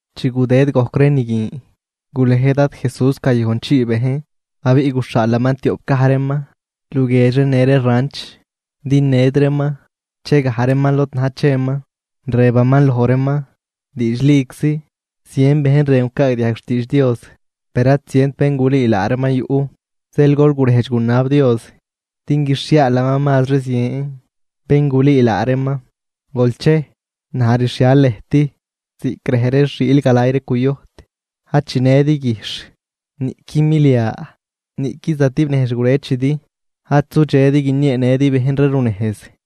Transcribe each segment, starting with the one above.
Chi gudëd gojc ree ni guin, gulej Dad Jesús gayojnchii bejn, abiꞌ guxhaalaman tioꞌp gaj reeman luguiedx ree në ree ranch din ned reeman che gaj reeman lod na̱j cheman. Rëbaman loj reeman: ―Diidxliczi, zien bejn rën gucaagdiajg xtiidx Dios, per ad zient bén gulüü laa reeman yuꞌ. Zeel gol gurejdx gunab Dios din guixhiaalaman mazri zien bén gulüü laa reeman. Gol chej, naj rxhial lëjt ziꞌc rej ree xiil galay ree cuyojt. Ad chinëdi guijxh, niꞌqui milia, niꞌqui zatib nejz xgurëchidi, ad sudxedi guinieenëdi bejn ree runejz.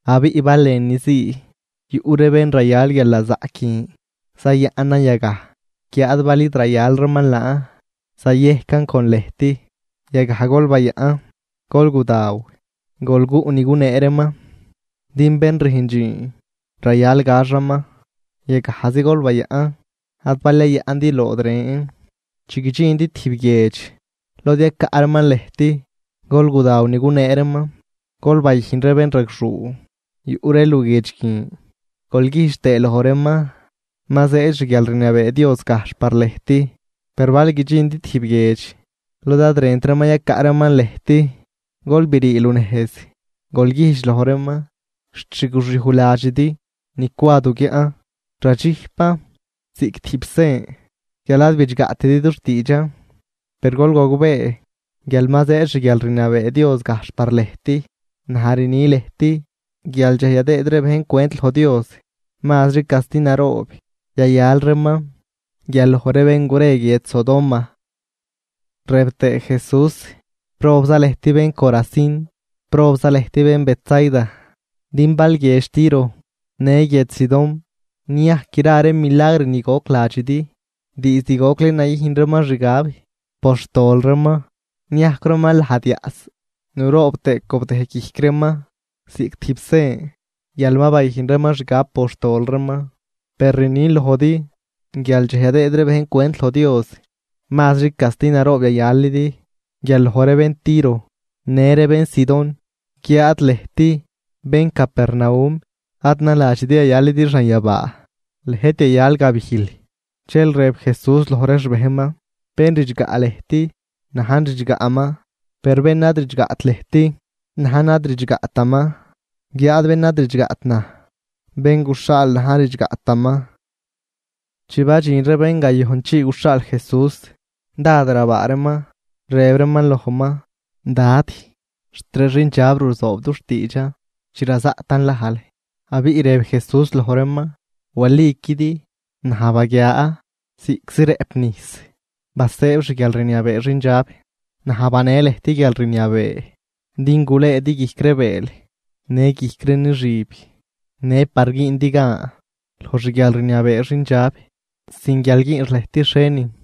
Abiꞌ bal lënüzii yuꞌ ree bén rayal guialnazaꞌc guin, zayaꞌnan yagaj. Guiáad bal id rayal reeman laan zayejcan con lëjt. Yagaj gol bayaꞌn, gol gudaw, gol guꞌ ni gunee reeman. Din bén rüjn dxiin rayal gaxaman. Yagajzi gol bayaꞌn ad bal yayaꞌndi lood ren. Chi guidxindi tijb guiedx lod yacaꞌ reeman lëjt, gol gudaw ni gunee reeman. Gol bayüjn ree bénragxuu yuꞌ ree luguiedx guin, gol güjdx tëë loj reeman: “Ma zëëd xguialrniabee Dios gajxh par lëjt.” Per bal guidxindi tijb guiedx lod ad rënt reeman yacaꞌ reeman lëjt, gol brii lunejz, gol güjdx loj reeman: “Xt xgoxyuj ladxidi ni cwa du guiaꞌn, radxijpan ziꞌc tijb sen guial ad bidxgaꞌtidi dux tiidxan. Per gol gogbee, guial ma zëëd xguialrniabee Dios gajxh par lëjt.” Naj rni lëjt guial dxej yadëëd ree bejn cwent loj Dios, mazri casti naroob yayal reeman guial loj ree bén gure guiedx Sodoma. Rëb tëë Jesús: ―¡Probza lëjt bén Corazín! ¡Probza lëjt bén Betsaida! Din bal guiedx Tiro në guiedx Sidón niajc gra ree milagr ni goc ladxidi, diizd gocli nayüjn reeman xgab por xtol reeman, niajcw reeman lajd yaꞌs nuroob tëë cobdëj guijc reeman ziꞌc tijb sen guial ma bayüjn reeman xgab por xtol reeman. Per rnin lojdi guial dxej yadëëd ree bejn cwent loj Dios, mazri casti naroob yayalidi guial loj ree bén Tiro në ree bén Sidón. Guiáad lëjt, bén Capernaum, ad naladxidi yayalidi xanyabaa, lëjt yayal gabijl. Dxel rëb Jesús loj ree xbejnman: ―Bén ridxgaꞌ lëjt, najn ridxgaꞌman, per bén ad ridxgaꞌt lëjt, najn ad ridxgaꞌtaman. Guiáad bén ad ridxgaꞌt naj, bén guxhaal najn ad ridxgaꞌtaman. Chi badxin ree bén gayojnchii guxhaal Jesús, dád rabaa reeman rëb reeman lojman: ―Dad, xt ree xindxab ruzoob dux tiidxan chi razaꞌtan lajl. Abiꞌ rëb Jesús loj reeman: ―Waliquidi, naj baguia, ziꞌczi rëꞌp nijs basëëb xguialrniabee xindxab. Naj banee lëjt guialrniabee din gulëëdi guijc ree bëël në guijc ree nixüb, në par güündi gan loj xguialrniabee xindxab sin guial güünx lëjt xhienin.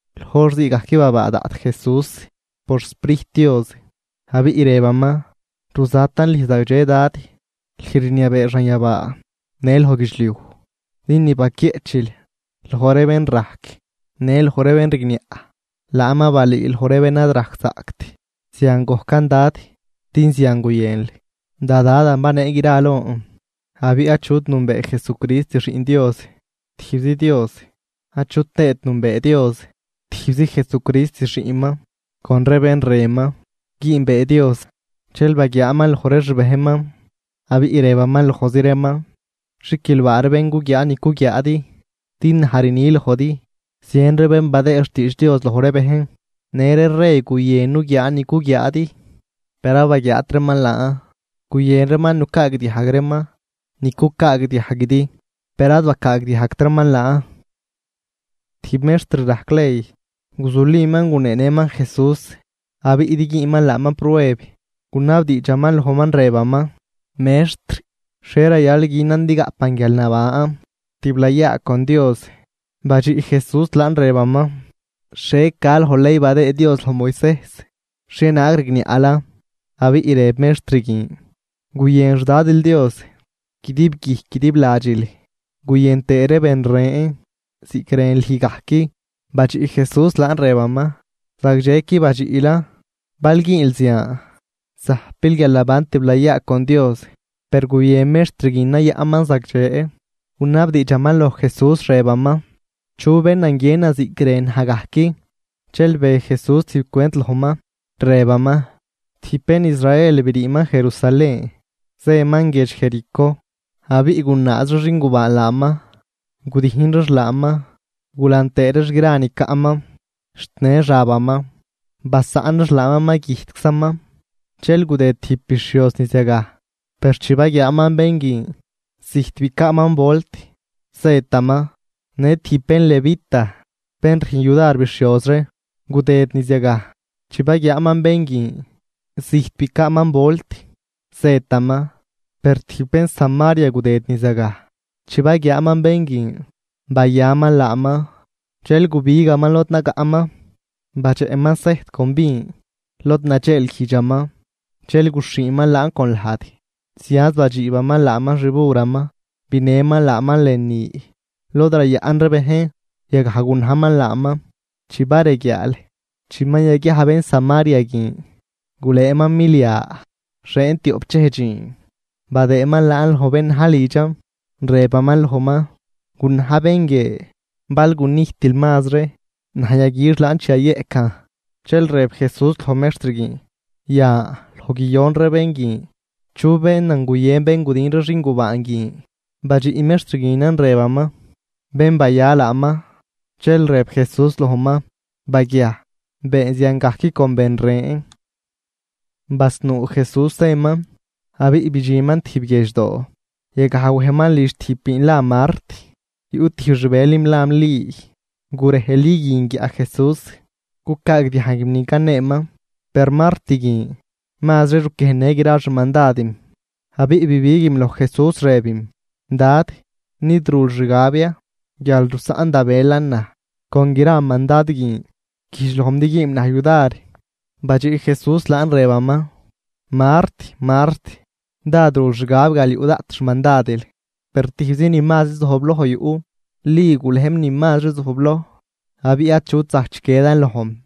Loj hor ziigajc babaa daꞌt Jesús por xSprijt Dios, abiꞌ rëbaman: ―Ruzatan lüj zagdxe, Dad, lüj rniabee xanyabaa në loj guidxliuj, din ni baquieꞌchil loj ree bén rajc në loj ree bén rigniaꞌ, laan ma balüül loj ree bén ad rajczaꞌct. Zian gojcan Dad, din zian guyënl. ’Da Dadan banee gra lon. Abiꞌ achut nünbee Jesucrist Xiꞌn Dios, tijbzi Dios, achu tëët nünbee Dios, tijbzi Jesucrist xiꞌnman con ree bén rënman güünbee Dios. Dxel baguiaaman loj ree xbejnman, abiꞌ rëbaman lojzi reeman: ―Xiquilbaa ree bén guguiaa ni cuguiaadi. Din naj rni lojdi, zien ree bén badëë xtiidx Dios loj ree bejn në ree rey guyën nuguiaa ni cuguiaadi, per ad baguiaat reeman laan. Guyën reeman nucaagdiajg reeman ni cucaagdiajguidi, per ad bacaagdiajgt reeman laan. Tijb mextr rajc ley guzuliman guneenëman Jesús. Abiꞌ din güünman laaman prueb, gunabdiidxaman lojman rëbaman: ―Mextr, ¿xhie rayal günan din gaꞌpan guialnaban tiblayaa con Dios? Badxiꞌ Jesús laan rëbaman: ―¿Xhie ca loj ley badëë Dios loj Moisejs? ¿Xhienaag rigniaꞌlan? Abiꞌ rëb mextr guin: ―“Guyën xDadil Dios guidib guijc guidib ladxil guyën tëë ben ren ziꞌc rën lüj gajc.” Badxiꞌ Jesús laan, rëbaman: ―Zagdxequi badxiꞌlan. Bal güünl zian zajpil guialnaban tiblayaa con Dios. Per guyën mextr guin nayaꞌnman zagdxe, gunabdiidxaman loj Jesús, rëbaman: ―¿Chu bénan guiënan ziꞌc rën naj gajc? Dxel be Jesús tijb cwent lojman, rëbaman: ―Tijb bén Israel briiman Jerusalén zëman guiedx Jericó. Abiꞌ gunaaz ree xingubaan laaman, gudijn reex laaman gulan tëë reex gra ni caꞌman xt në xabaman, basaꞌn reex laaman ma güjtczaman. Dxel gudëd tijb bixhioz niz yagaj, per chi baguiaaman bén guin, zijt bicaaman volt, zëtaman. Në tijb bén Levita bén rüjn yudar bixhioz ree, gudëd niz yagaj, chi baguiaaman bén guin, zijt bicaaman volt, zëtaman. Per tijb bén Samaria gudëd niz yagaj, chi baguiaaman bén guin, bayaman laaman, dxel gubigaman lod nagaꞌman, badxeꞌman sejt con vin lod nadxeelguijdxaman dxel guxhiiman laan con lajd. Zianz badxiibaman laaman xburaman binëman laaman lënü lod rayaꞌn ree bejn. Yagaj gunajman laaman. Chi bareguiaal, chi ma yaguiaj bén Samaria guin, gulëëman milia xieen tioꞌp dxej dxiin badëëman laan loj bén na̱j lidxan, rëbaman lojman: “Gunaj bén guie, bal gunijtil mazri, naj yaguix laan chi yayeꞌcan.” Dxel rëb Jesús loj mextr guin: ―Yan, loj guiyon ree bén guin, ¿chu bénan guyën bén gudin ree xingubaan guin? Badxiꞌ mextr guinan rëbaman: ―Bén baya laaman. Dxel rëb Jesús lojman: ―Baguiaj, been ziangajc con ben ren. Basnuu Jesús zëman abiꞌ bidxinman tijb guiedxdoo, yagaj wejman lidx tijb biin la Mart. Yuꞌ tijb xbëlim lam Li. Gurej Li guin guiaꞌ Jesús cucaagdiajguim ni caneeman. Per Mart guin mazri ruquiejnnë gra xmandadim, abiꞌ bibiguim loj Jesús rëbim: ―Dad, ¿nid rul xgab ya guial rusaꞌn da bëlan naj con gra mandad guin? Güjdx lojm din güünm naj yudar. Badxiꞌ Jesús laan rëbaman: ―Mart, Mart, dád rul xgab guial yuꞌ daꞌt xmandadil. Per tijbzi ni mazri zojbloj yuꞌ. Li gulejm ni mazri zojbloj, abiꞌ achut zajc chiquiedan lojm.